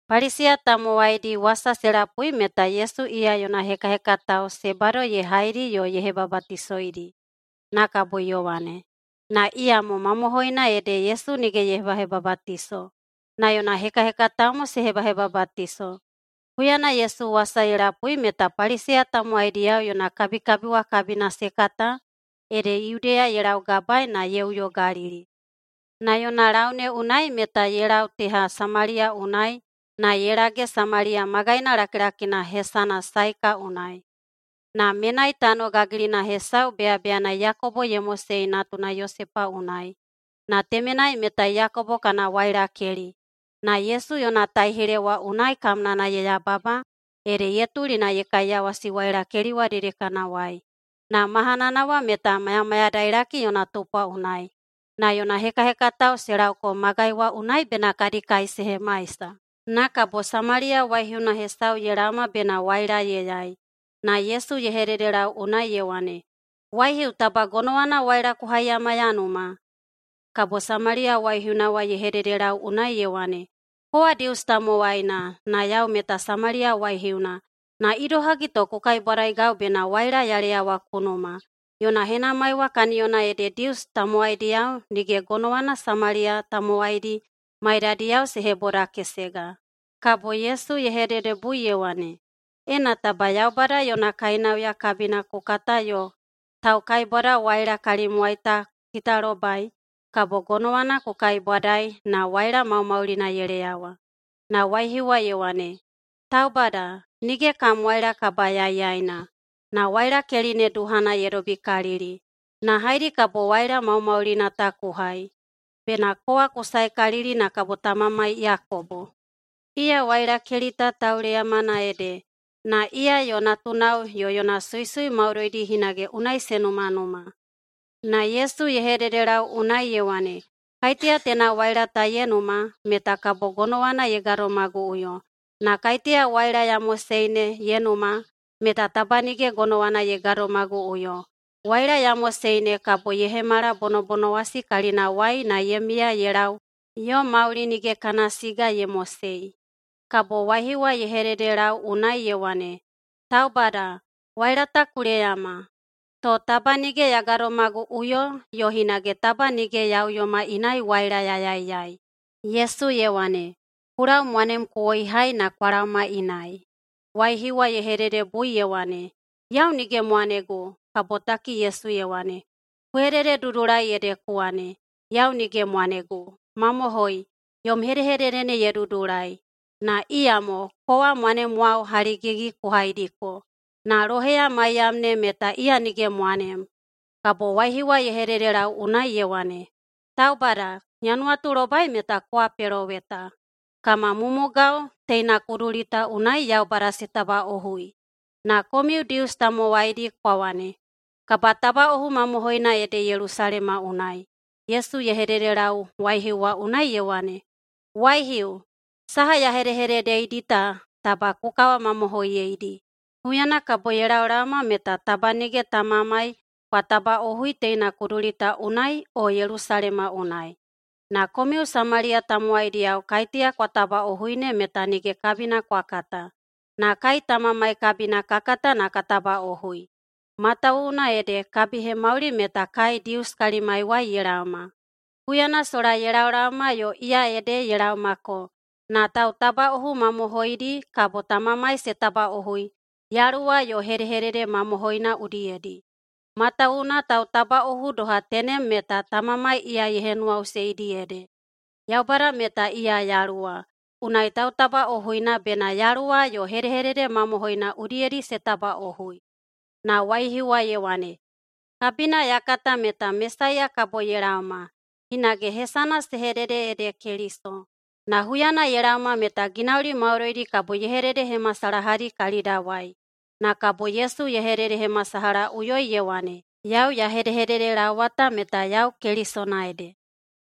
Paliseya tamowaidi wasa se lapui meta Yesu iya yona hekahekatao se bado ye haidi yo ye hebabatisoidi, na kabo Yowane. Na iyamo mamohoina ede Yesu nige ye hebahebabatiso, na yona hekahekatao mo se hebahebabatiso. Huyana Yesu wasa ye lapui meta Paliseya tamowaidiyao yona kabikabi wa kabina se kata, ede Yudeya ye laugabae na ye uyo Galili. Na yona lau ne unai meta ye lau teha Samaliya unai na ye lage Samaliya magaina lakilakina hesana Saeka unai. Na menai tano gagilina hesau beyabeyana Yakobo ye mosei natuna Yosepa unai. Na temenai meta Yakobo kana wailakeli. Na Yesu yona taihile wa unai kamnana ye yababa, ede ye tuli na ye kaiyawasi wailakeli wa dedekanawai. Na mahanana wa meta mayamayadailaki yona tupwa unai. Na yona hekahekatao se lauko magai wa unai bena kadi kai se hemaisa. Na kabo Samaliya waihiuna hesau ye laoma bena waila ye yai, na Yesu ye hededelau unai ye wane, “Waihiu, taba gonowana waila ku haiyama ya numa?” Kabo Samaliya waihiuna wa ye hededelau unai ye wane, “Kowa Dius tamowaina, na yau meta Samaliya waihiuna, na idohagi to ku kaibwadaigau bena waila ya leyawa ku numa?” Yona henamai wa kaniyona ede Dius tamowaidiyao nige gonowana Samaliya tamowaidi maidadiyao se hebodakesega. Kabo Yesu ye hededebui ye wane, “Ena taba Yaubada yona kainauya kabina ku kata yo taukaibwadawaila kalimwai ta ku kitalobai, kabo gonowana ku kaibwadaei na waila maumaulina ye leyawa.” Na waihiu wa ye wane, “Taubada, nige kam waila kabayaiyaina, na wailakeli ne duhana ye dobikalili. Na haedi kabo waila maumaulina ta ku hai? Bena kowa ku saekalili na kabo tamamai Yakobo? Iya wailakeli ta tauleyamana ede. Na iya yo natunao yo yona suisui maudoidi hinage unai se numanuma.” Na Yesu ye hededelau unai ye wane, “Kaiteya teina waila ta ye numa, meta kabo gonowana ye gadomaguꞌuyo. Na kaiteya waila ya mosei ne ye numa, meta taba nige gonowana ye gadomaguꞌuyo. Waila ya mosei ne kabo ye hemala bonobonowasi kalinawai na ye miya ye lau yo mauli nige kana siga ye mosei.” Kabo waihiu wa ye hededelau unai ye wane, “Taubada, waila ta ku leyama, to taba nige ya gadomaguꞌuyo yo hinage taba nige ya uyoma inai waila ya yaiyai.” Yesu ye wane, “Ku lau mwanem ku woihai na kwa laoma inai.” Waihiu wa ye hededebui ye wane, “Yau nige mwanegu.” Kabotaki Yesu ye wane, “Ku hedededudulai ede ku wane, ‘Yau nige mwanegu.’ Mamohoi, yom hedehedede ne ye dudulai. Na iyamo kowa mwanemwao haligigi ku haidiko, na loheya maiyam ne meta iya nige mwanem.” Kabo waihiu wa ye hededelau unai ye wane, “Taubada, ya nuwatulobai meta kowa peloweta. Kama mumugao teina kuduli ta unai Yaubada se tabatabaꞌohui, na komiu Dius tamowaidi kwa wane, ‘Kabatabaꞌohu mamohoina ede Yelusalema unai.’” Yesu ye hededelau waihiu wa unai ye wane, “Waihiu, saha ya hedehededeidi ta taba ku kawamamohoiyeidi. Huyana kabo ye laolaoma meta taba nige Tamamai kwa tabaꞌohui teina kuduli ta unai o Yelusalema unai. Na komiu Samaliya tamowaidiyao kaiteya kwa tabaꞌohui ne meta nige kabina kwa kata, na kai Tamamai kabina ka kata na ka tabaꞌohui, matawuwuna ede kabihemauli meta kai Dius kalimaiwai ye laoma. Huyana sola ye laolaoma yo iya ede ye laomako na tautabaꞌohu mamohoidi kabo Tamamai se tabaꞌohui yaluwa yo hedehededemamohoi udiyedi, matawuwuna tautabaꞌohu doha tenem meta Tamamai iya ye henuwaꞌuseidi ede. Yaubada meta iya yaluwa, unai tautabaꞌohuina bena yaluwa yo hedehededemamohoi udiyedi se tabaꞌohui.” Na waihiu wa ye wane, “Kabina ya kata meta Mesaiya kabo ye laoma. Hinage hesana se hedede ede Keliso. Na huyana ye laoma meta ginauli maudoidi kabo ye hededehemasalahadi kalidawai.” Na kabo Yesu ye hededehemasalahaꞌuyoi ye wane, “Yau ya hedehededelaowa ta meta yau Kelisona ede.”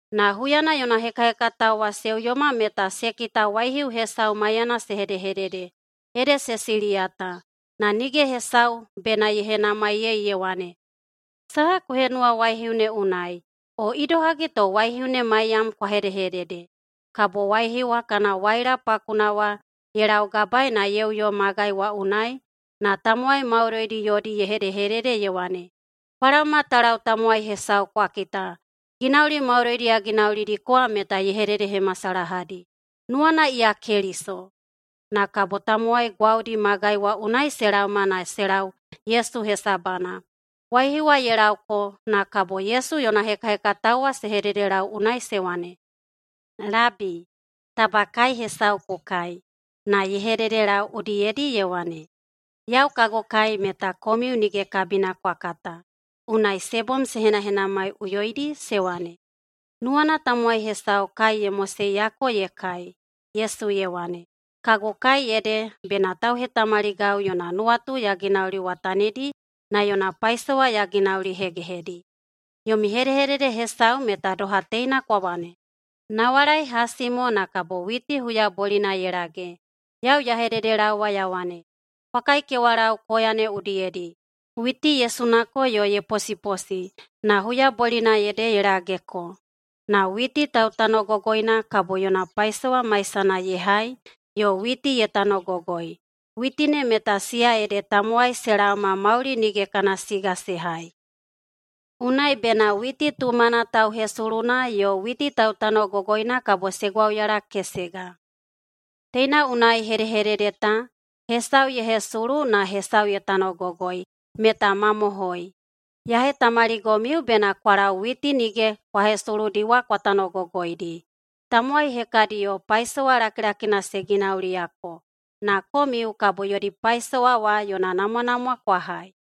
Na huyana yona hekahekatao wa se uyoma meta se kita waihiu hesau maiyana se hedehedede, ede se siliyata. Na nige hesau bena ye henamaiyei ye wane, “Saha ku henuwa waihiu ne unai?” o, “Idohagi to waihiu ne maiyam kwa hedehedede?” Kabo waihiu wa kana waila pakuna wa ye laugabaei na ye uyo magai wa unai, na tamowai maudoidi yodi ye hedehedede ye wane, “Kwa laoma ta lau tamowai hesau kwa kita. Ginauli maudoidi ya ginaulidiko wa meta ye hededehemasalahadi. Nuwana iya Keliso?” Na kabo tamowai gwaudi magai wa unai se laoma na se lau Yesu hesabana. Waihiu wa ye lauko, na kabo Yesu yona hekahekatao wa se hededelau unai se wane, “Labi, taba kai hesau ku kai.” Na ye hededelau udiyedi ye wane, “Yau kagu kai meta komiu nige kabina kwa kata.” Unai se bom se henahenamaiꞌuyoidi se wane, “Nuwana tamowai hesau kai ye moseiyako ye kai.” Yesu ye wane, “Kagu kai ede bena tauhetamaligau yona nuwatu ya ginauliwatanidi na yona paisowa ya ginaulihegehedi. Yomi hedehedede hesau meta doha teina kwa wane, ‘Nawalai hasi mo na kabo witi huyabolina ye lage.’ Yau ya hededelaowa ya wane, kwa kaikewalau koya ne udiyedi! Witi ye sunako yo ye posiposi, na huyabolina ede ye lageko. Na witi tautanogogoina kabo yona paisowa maisana ye hai yo witi ye tanogogoi. Witi ne meta siya ede tamowai se laoma mauli nige kana siga se hai. Unai bena witi tumana tauhesuluna yo witi tautanogogoina kabo se gwauyalakesega. Teina unai hedehedede ta, ‘Hesau ye hesulu na hesau ye tanogogoi’ meta mamohoi. Ya hetamaligomiu bena kwa lau witi nige kwa hesuludi wa kwa tanogogoidi. Tamowai hekadiyo paisowa lakilakina se ginauliyako, na komiu kabo yodi paisowa wa yona namwanamwa kwa hai.”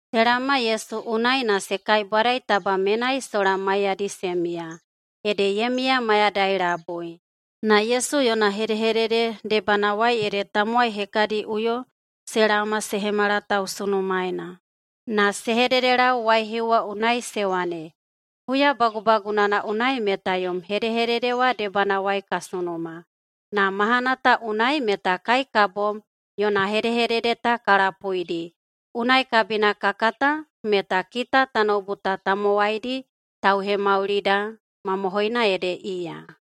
Se laoma Yesu unai na se kaibwadai taba menai sola maiyadi se miya, ede ye miya mayadai labui. Na Yesu yona hedehedede debanawai ede tamowai hekadiꞌuyo se laoma se hemala tausunumaena. Na se hededelau waihiu wa unai se wane, “Huya bagubagunana unai meta yom hedehedede wa debanawai ka sunuma. Na mahana ta unai meta kai ka bom yona hedehedede ta ka lapuidi, unai kabina ka kata meta kita tanoubu ta tamowaidi Tauhemaulida mamohoina ede iya.”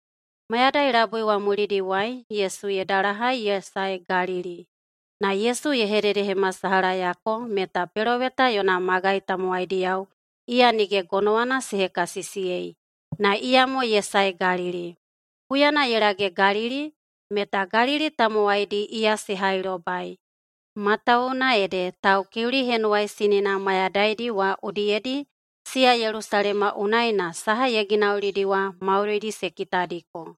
Mayadai labui wa mulidiwai Yesu ye dalahai ye sae Galili. Na Yesu ye hededehemasalahayako meta peloweta yona magai tamowaidiyao iya nige gonowana se hekasisiyei, na iyamo ye sae Galili. Huyana ye lage Galili, meta Galili tamowaidi iya se hailobai, matawuwuna ede Taukiuli Henuwaisinina mayadaidi wa udiyedi siya Yelusalema unai na saha ye ginaulidi wa maudoidi se kitadiko.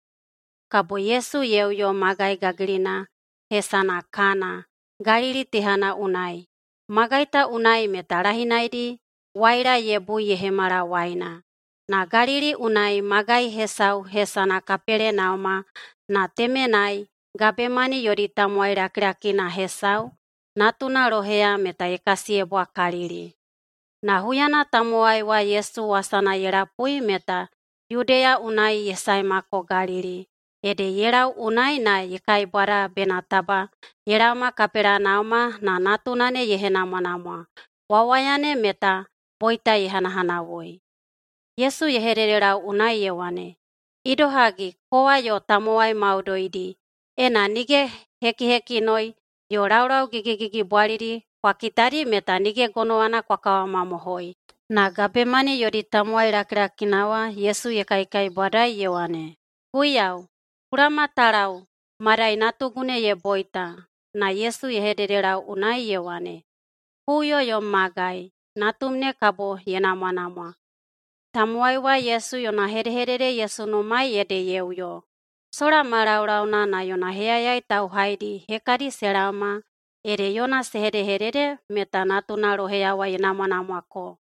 Kabo Yesu ye uyo magai gagilina hesana Kana, Galili tehana unai. Magai ta unai meta lahinaidi waila ye bui ye hemala waina. [Na Galili unai magai hesau hesana] Kapelenauma, na temenai gabemani yodi tamowai lakilakina hesau, natuna loheya meta ye kasiyebwakalili. Na huyana tamowai wa Yesu wasana ye lapui meta Yudeya unai ye saemako Galili, ede ye lau unai na ye kaibwadai bena taba ye laoma Kapelenauma na natuna ne ye henamwanamwa. Wawaya ne meta boita ye hanahanawui. Yesu ye hededelau unai ye wane, “Idohagi, kowa yo tamowai maudoidi, ena nige hekihekinoi yo laulau gigigigibwalidi kwa kitadi meta nige gonowana kwa kawamamohoi!” Na gabemani yodi tamowai lakilakina wa Yesu ye kaikaibwadai ye wane, “Guiyau, ku laoma ta lau, madai natugu ne ye boita.” Na Yesu ye hededelau unai ye wane, “Ku uyo yom magai. Natum ne kabo ye namwanamwa.” Tamowai wa Yesu yona hedehedede ye sunumaei ede ye uyo. Sola ma laulauna na yona heyayai tauhaidi hekadi se laoma ede yona se hedehedede meta natuna loheya wa ye namwanamwako.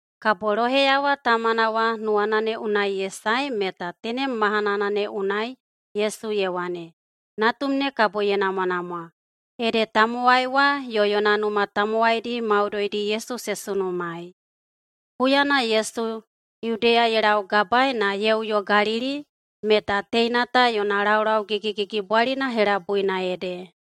Kabo loheya wa tamana wa nuwana ne unai ye sae meta tenem mahanana ne unai Yesu ye wane, “Natum ne kabo ye namwanamwa.” Ede tamowai wa yo yona numa tamowaidi maudoidi Yesu se sunumaei. Huyana Yesu Yudeya ye laugabae na ye uyo Galili, meta teina ta yona laulau gigigigibwalina helabuina ede.